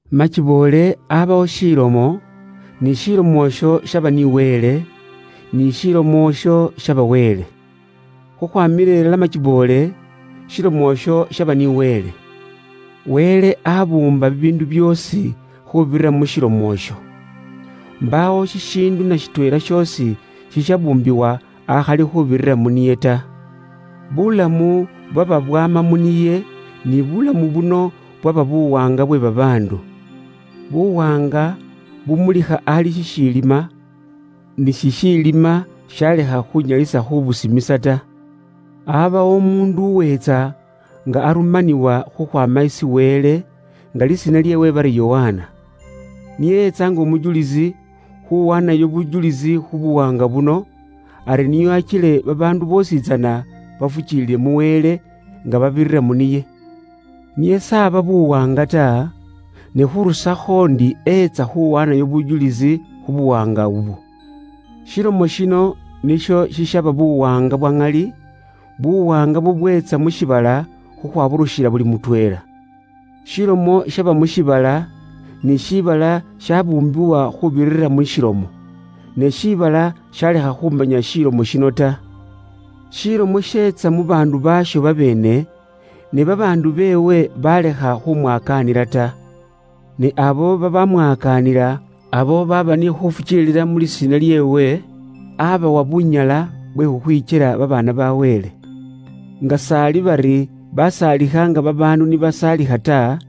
Makiboole aabawo Ilomo, n'Ilomo iyo yaba ni Wele, n'Ilomo iyo yaba Wele. Khukhwaamila ilala makiboole Ilomo iyo yaba ni Wele. Wele aabuumba bibiindu byoosi khuubirira mu Lomo iyo. Mbaawo shishiindu na shitweela shoosi shishabuumbibwa ta akhali khuubirira mu niye. Buulamu bwaba bwaama mu niye, ni buulamu buno bwaba buwaanga bwe babaandu. Buwaanga bumulikha ali shishiilima, ni shishiilima shalekha khunyalisa khubusimisa ta. Aabawo umuundu uweetsa nga arumanibwa khukhwaama isi Wele, nga lisiina lyeewe bari Yokana. Niye eetsa nga umujulisi, khuwaanayo bujulisi khu buwaanga buno, ari nio akile babaandu boositsana bafukiilile mu Wele nga babirira mu niye. Niye s'aba buwaanga ta, ne khurusakho ndi eetsa khuwaanayo bujulisi khu buwaanga ubwo. Ilomo yino niyo iyaba buwaanga bwa ŋali, buwaanga bubweetsa mu shiibala khukhwaburukhila buli mutweela. Ilomo yaba mu shiibala, ni shiibala shabuumbibwa khuubirira mu'lomo nyene. Ne shiibala shalekha khumanya Ilomo yino ta. Ilomo yeetsa mu baandu baayo babeene, ne babaandu beewe balekha khumwakaanila ta. Ne abo babamwakaanila, abo baaba ni khufukiilila mu lisiina lyeewe, abawa bunyala bwe khukhwikyela babaana ba Wele, nga s'ali bari basaalikha nga babaandu ni basaalikha ta,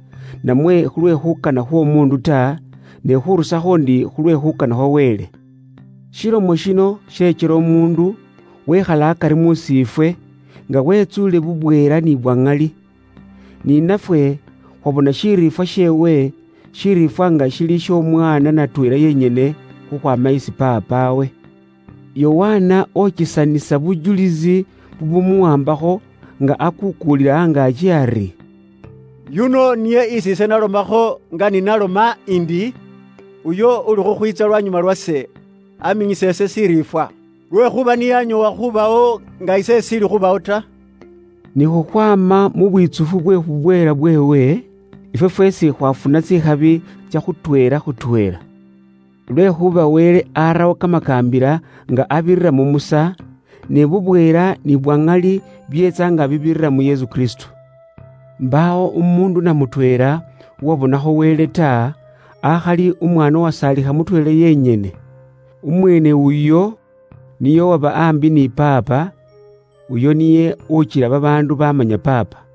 namwe khulwe khuukana khw'omuundu ta, ne khurusakho ndi khu lwe khuukana khwa Wele. Ilomo yino yekyela umuundu, wekhala akari musiifwe, nga wetsuule bubweela ni bwa ŋali. Ni nafwe khwabona shiriifwa sheewe, shiriifwa nga shili sh'Omwaana natweela yenyene khukhwaama isi Paapawe. Yokana okesanisa bujulisi bubumuwaambakho, nga akuukuulila angaaki ari, “Yuno niye isi ise nalomakho nga ni naloma indi, ‘Uyo ulikhukhwiitsa lwanyuma lwase, aminyisa ise shiriifwa. Lwekhuuba niye anyoowa khubawo nga ise ishiili khubawo ta.’” Ni khukhwaama mu bwitsufu bwe bubweela bweewe, ifwe fweesi khwafuna tsikhabi tsya khutweela khutweela. Lwekhuuba Wele arawo kamakaambila nga abirira mu Musa, ne bubweela ni bwa ŋali byeetsa nga bibirira mu Yesu Kristo. Mbaawo umuundu na mutweela uwabonakho Wele ta, akhali Umwaana uwasaalikha mutweela yenyene. Umweene uyo niye uba aambi ni Paapa, uyo niye ukila babaandu bamanya Paapa.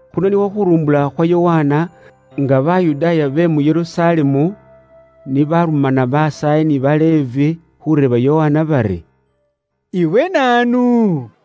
Khuno nikhwo khurumbula khwa Yokana, nga Bayudaaya be mu Yerusalemu ni baarumana basaayi ni ba Levi khuureeba Yokana bari, “Iwe naanu?”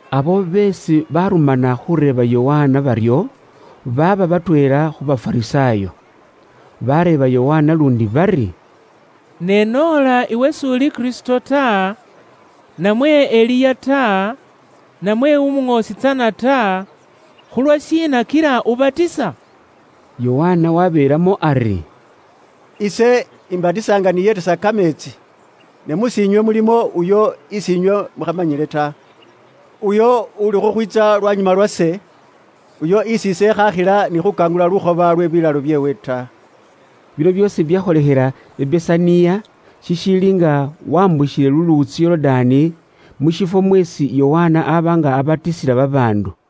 Abo beesi barumana khureeba Yokana baryo, baaba batweela khu Bafarisaayo. Baareeba Yokana luundi bari, “Ne noola iwe s'uli Kristo ta, namwe Eliya ta, namwe Umuŋoosi tsana ta, khulwashiina kila ubatisa?” Yokana wabeelamo ari, “Ise imbatisa nga niyeetisa kameetsi. Ne mus'iinywe mulimo uyo isi inywe mukhamanyile ta; Uyo uuli khukhwiitsa lwanyuma lwase, uyo isiise ikhaakhila ni khukangulula lukhoba lwe bilaalo byeewe ta.” Bino byoosi byakholekhela i Besaniya, shishiili nga wambukhile luluutsi Yorudaani, mu shifwo mweesi Yokana aaba nga abatisila babaandu.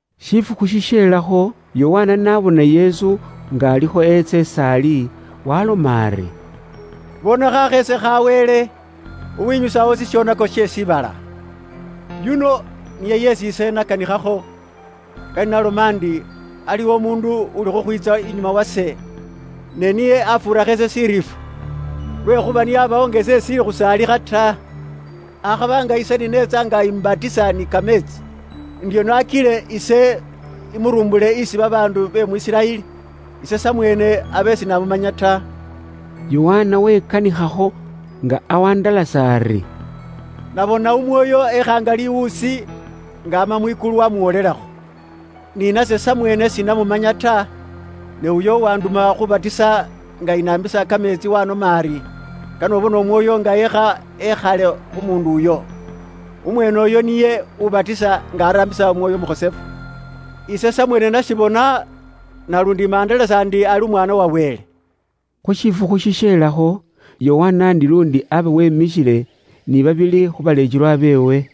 Shifukhu shisheelakho, Yokana n'abona Yesu nga alikho eetsa is'ali waaloma ari, “Bona Khasheese kha Wele, uwinyusawo shishonako she shiibala! Yuno niye yeesi ise nakanikhakho, nga ni naloma ndi, ‘Aliwo umuundu uli khukhwiitsa inyuma wase, ne niye afuurakho ise shiriifwa. Lwekhuuba niye aabawo nga ise ishiili khusaalikha ta.’ Akhaba nga ise ni neetsa nga imbatisa ni kameetsi, ndi nio akile ise imurumbule isi babaandu be mu Isiraeli, ise samweene abe sinamumanya ta.” Yokana wekanikhakho nga awandalasa ari, “Nabona Umwoyo ekha nga liwuusi, nga ama mwikulu, wamuwolelakho. Ni nase samweene sinamumanya ta, ne uyo uwanduma khuubatisa nga inaambisa kameetsi waanoma ari, ‘Kane ubone Umwoyo nga eekha ekhale khu muundu uyo. Umweene uyo niye ubatisa nga araambisa Umwoyo Umukhosefu.’ Ise samweene nashibona, naluundi imandalasa ndi ali Umwaana wa Wele.” Khu shifukhu shishelakho, Yokana ndi luundi aba wemikhile ni babili khu baleekelwa beewe.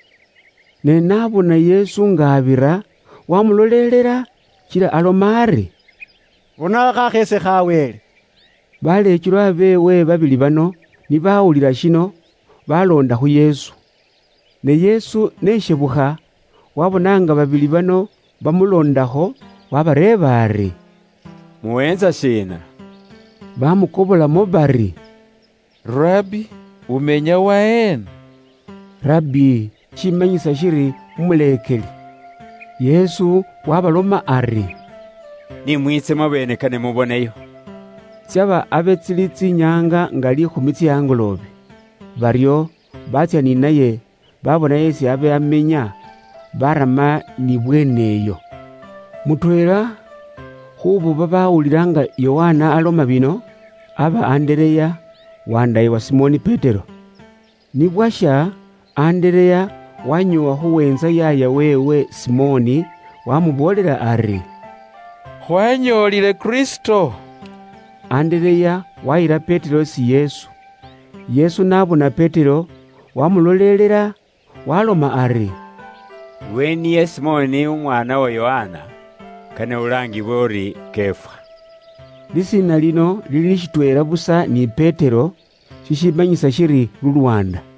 Ne n'abona Yesu nga abira wamulolelela, kila aloma ari, “Bona Khasheese kha Wele.” Baleekelwa beewe babili bano ni bawulila shino, baloonda khu Yesu. Ne Yesu n'eshebukha waabona nga babili bano bamuloondakho, waabareeba ari, “Muweentsa shiina?” Baamukobolamo bari, “Rabbi, umenya waheena?” “Rabbi” shishimanyisa shiri Umuleekeli. Yesu waabaloma ari, “Ni mwiitse mwabeene kane muboneyo.” Tsyaba abe tsili tsinyaanga nga liikhumi tsye angoloobe. Baryo batsya ni naye babona esi abe amenya, barama n'ibweene iyo. Mutweela khuubo babawulila nga Yokana aloma bino, aba Andereya, wandaaye wa Simoni Petero. Ni bwasha, Andereya waanyoowa khuweentsa yaaya weewe Simoni, waamuboolela ari, “Khwaanyoolile Kristo.” Andereya waayila Petero isi Yesu. Yesu n'abona Petero, waamulolelela, waaloma ari, “Iwe niye Simoni umwaana uwa Yokana? Kane ulaangibwe uri Kefa.” (Lisiina lino lili shitweela busa ni Petero, shishimanyisa shiri lulwaanda).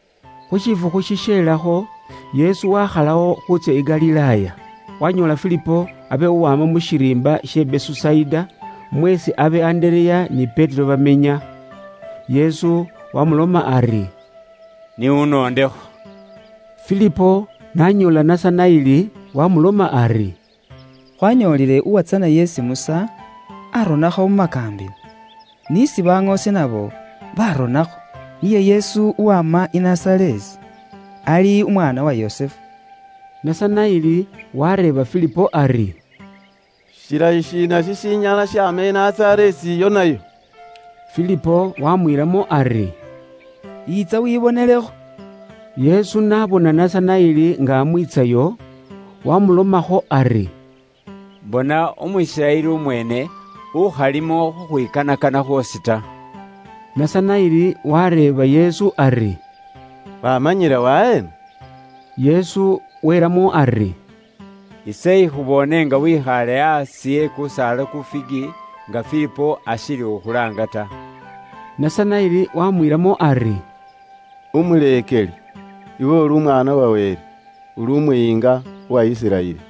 Khu shifukhu shisheelakho, Yesu waakhalawo khuutsya i Galilaaya. Waanyoola Filipo abe uwaama mu shiriimba she Besusaida, mweesi abe Andereya ni Petero bamenya. Yesu waamuloma ari, “N'unoondekho.” Filipo n'anyoola Nasanaeli wamuloma ari, “Khwanyoolile uwatsana yeesi Musa aronakho mu makaambila, n'isi baŋoosi nabo baaronakho. Niye Yesu uwama i Nazareesi, ali umwaana uwa Yusufu.” Nasanaeli wareeba Filipo ari, “Shilayi shiina shishinyala shaama i Nazareesi iyo nayo?” Filipo wamwiilamo ari, “Yiitsa wibonelekho.” Yesu n'abona Nasanaeli nga amwiitsayo, wamulomakho ari, “Ilala bona umu Isiraeli umweene, ukhalimo khukhwikanakana khwoosi ta.” Nasanaeli wareeba Yesu ari, “Wamanyila waheena?” Yesu welamo ari, “Ise ikhuboone nga wekhaale aasi e kusaala ku figi, nga Filipo ashiili khukhulaanga ta.” Nasanaeli wamwiilamo ari, “Umuleekeli, iwe uli Umwaana wa Wele! Uli Umuyiinga uwa Isiraeli!”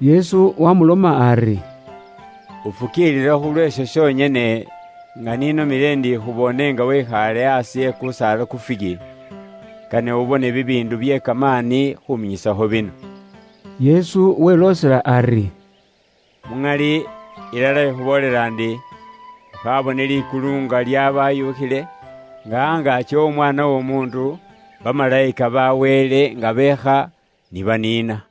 Yesu wamuloma ari, “Ufukiilila khulw'esho shonyene, nga ni nomile ndi ikhuboone nga wekhaale aasi e kusaala ku figi? Kane ubone bibiindu bye kamaani khuminyisa bino.” Yesu weloosela ari, “Muŋali, ilala ikhuboolela ndi, ukhaabone likulu nga lyabaayukhile, nga angaaki w'Omwaana w'Omuundu, bamalayika ba Wele nga beekha ni baniina.”